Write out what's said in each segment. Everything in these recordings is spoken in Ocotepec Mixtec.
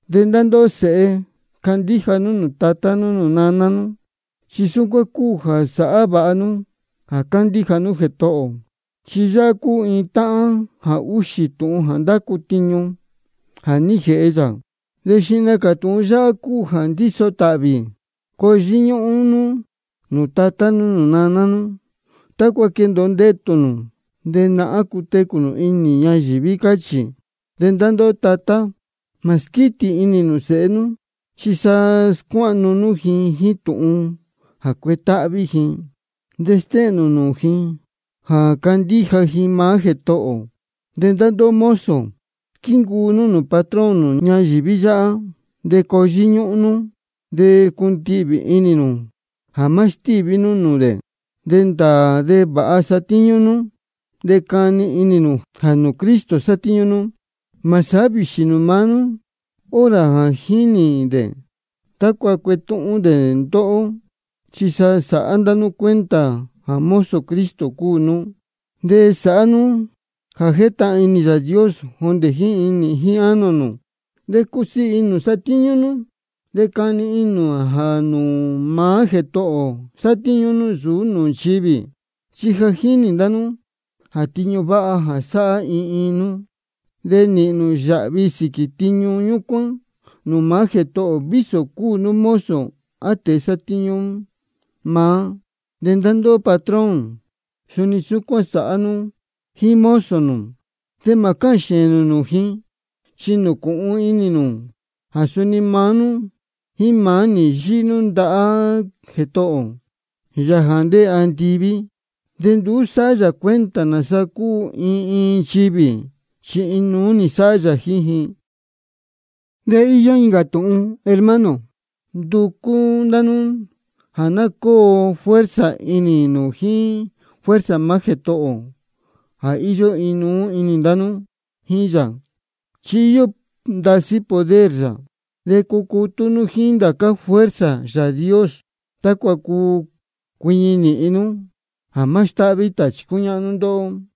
De ndá ndóhó sēhe, candíja nú nūū tatá nú nūū naná nú, chi súcuán cúu jā sáhá vāha nú jā cándíja nú Jētohō ō. Chi yáhá cúu iin táhán jā úxī tūhun jā ndácu tiñu jā ní jēhe yā, de xihna cā tūhun yáhá cúu jā ndíso tāhvī: Coo yíñúhún nú nūū tatá nú nūū naná nú, tácua quendōo ndetū nū, de náhán cutecū nū inī ñayīví, cáchī. De ndá ndóhó tatá, mā squítī inī nū sēhe nú, chi sa scuáhnu nú ji jíín tūhun jā cuetáhví ji, de stéhēn nū nūū ji jā candíja ji maá Jētohō ō. De ndá ndóhó mozo, squíncuu nú nūū patrón nū ñayīví yáhá, de coo yíñúhún nú de cundihvī inī nū jā má stíví nú nūū dē. De ndāā de vāha satíñú nú, de cani inī nū jā nūū Cristo sátíñú nú. Mā sátíñú vīxī nū maá hora jā jínī dē tácua cuetúhún dē ndóhó. Chi sa sāhá ndá nú cuenta jā mozo Cristo cúu nú. De sāhá nú jā jétahān inī Yāā Dios jondē jíín inī jíín ánō nū. De cusiī inī nū jā satíñú nú, de cani inī nū jā nūū maá Jētohō ō sátíñú nú, nsūú nūū nchivī. Chi ja jínī ndá nú jā tiñu váha jā sáhá iin iin nú, de nīhīn nū yāhvi sīquī tiñu ñúcuán nūū maá Jētohō ō, vísō cúu nú mozo á tēe jā sátíñú maá. De ndá ndóhó patrón, suni súcuán sāhá nú jíín mozo nū, de mā cáhān xēēn nū jíín ji. Chi nūcūhun inī nū jā suni maá nú jíín maá ji yíhí nú ndahá Jētohō ō, Yāā jā ndéē andiví. De nduú sáhá yā cuenta nāsa cúu iin iin nchivī, chi inuú sáhá yā jíín ji. De íyó incā tūhun, hermano. Nducú ndá nú jā ná cóo fuerza inī nū jíín fuerza maá Jētohō ō jā íyó inuú ndá nú jíín yā, chi íyó ndasí poder yā. De cucutú nú jíín ndācá fuerza Yāā Dios, tácua cuu cuiñi nīhin nú jā má stáhví tāchī cúñáhnú ndóhó.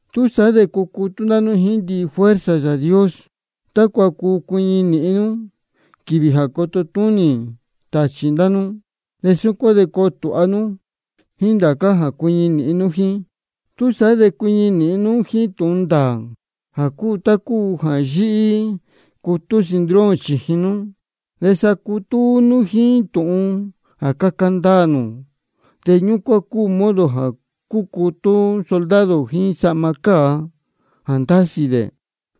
Túsaá de cucutú ndá nú jíín ndihi fuerza Yāā Dios, tácua cuu cuiñi nīhin nú quīvī jā coto túnī tāchī ndá nú. De súcuán coo tūha nú jíín ndācá ndihi jā cuiñi nīhin nú jíín. Túsaá de cuiñi nīhin nú jíín tūhun ndāā jā cúu tá cúu jā yíhí cutú cinturón chījin nú. De sacutú nú maá nú jíín tūhun jā caca ndaā nū, de ñúcuán cúu modo jā cúcutú soldado jíín sahma cāa jā ndásī dē.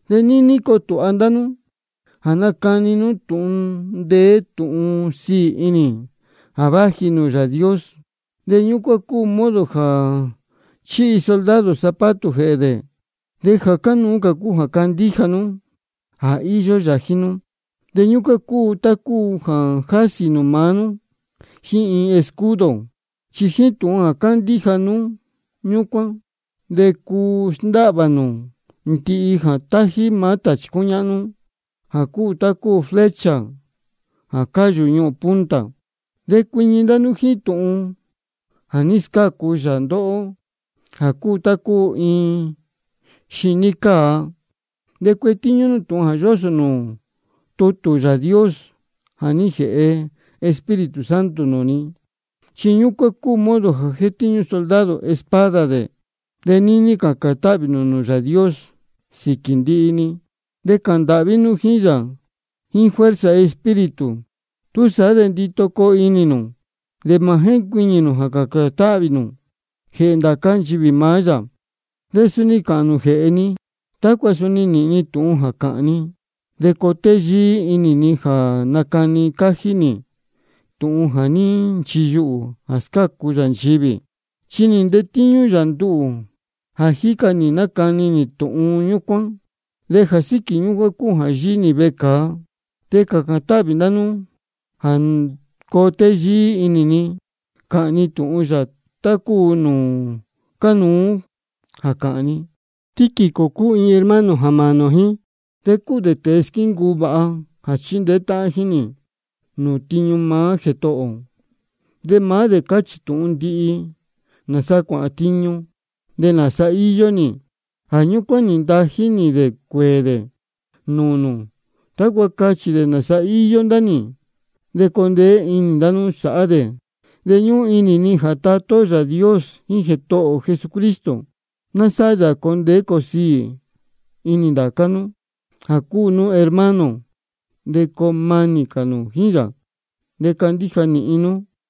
De níní coo tūha ndá nú jā nacani nú tūhun ndeé tūhun sīī inī jā váji nūū Yāā Dios. De ñúcuán cúu modo jā chíhi soldado zapato jēhē dē. De jā cánuú cā cúu jā candíja nú jā íyó yā jíín nú. De ñúcuán cúu tá cúu jā jásī nū maá nú jíín iin escudo. Chi jíín tūhun jā cándíja nú ñúcuán, de cuu sndáhvā nū ndihi jā tájí maá tāchī cúñáhnú, jā cúu tá cúu flecha jā cáyū yáñuhūn punta. De cuiñi ndá nú jíín tūhun jā ní scácu yā ndóhó, jā cúu tá cúu iin xiní cāa. De cuetíñú nú tūhun jā yósō nūū tutū Yāā Dios jā ní jēhe Espíritu Santo nūū nū. Chi ñúcuán cúu modo jā jétíñú soldado espada dē. De níní cācān táhvī nū nūū Yāā Dios sīquī ndihi-ni, de cāhān ndāhví nú jíín yā jíín fuerza Espíritu. Túsaá de ndito coo inī nū, de mā jéncuiñī nū jā cācān táhvī nū jēhē ndācá nchivī maá yā. De suni cāhān nū jēhē ni, tácua nīhīn ni tūhun jā cāhān ni, de coo téyíí inī ni jā nacani cájí nī tūhun jā ní nchiyuhū jā scácu yā nchivī. Chi nī ntetíñú yā nduhū jā jíca nī nácani nī tūhun ñúcuán, de jā síquī ñúcuán cúu jā yíhí nī vecāa. De cācān táhvī ndá nú jā coo téyíí inī ni cāhān ni tūhun yā, tá cúu nūū cánuú jā cāhān ni. Tíquico cúu iin hermano jā mānī ō jíín, de cúu dē tēe squíncuu vāha jā chíndeé táhán jíín nī nūū tiñu maá Jētohō ō. De maá dē cachī tūhun ndihi nāsa cuáhān tiñu nī de nāsa íyó nī. Jā ñúcuán nī ntají nī dē cuēē dē nūū nū, tácua cachī dē nāsa íyó ndá nī, de coo ndeé inī ndá nú sāhá dē. De ñúhún inī ni jā Tatá ó Yāā Dios jíín Jētohō ō Jesucristo, ná sáhá yā jā coo ndeé coo siī inī ndācá nú jā cúu nú hermano, de coo manī cā nū jíín yā, de candíja nīhin nú.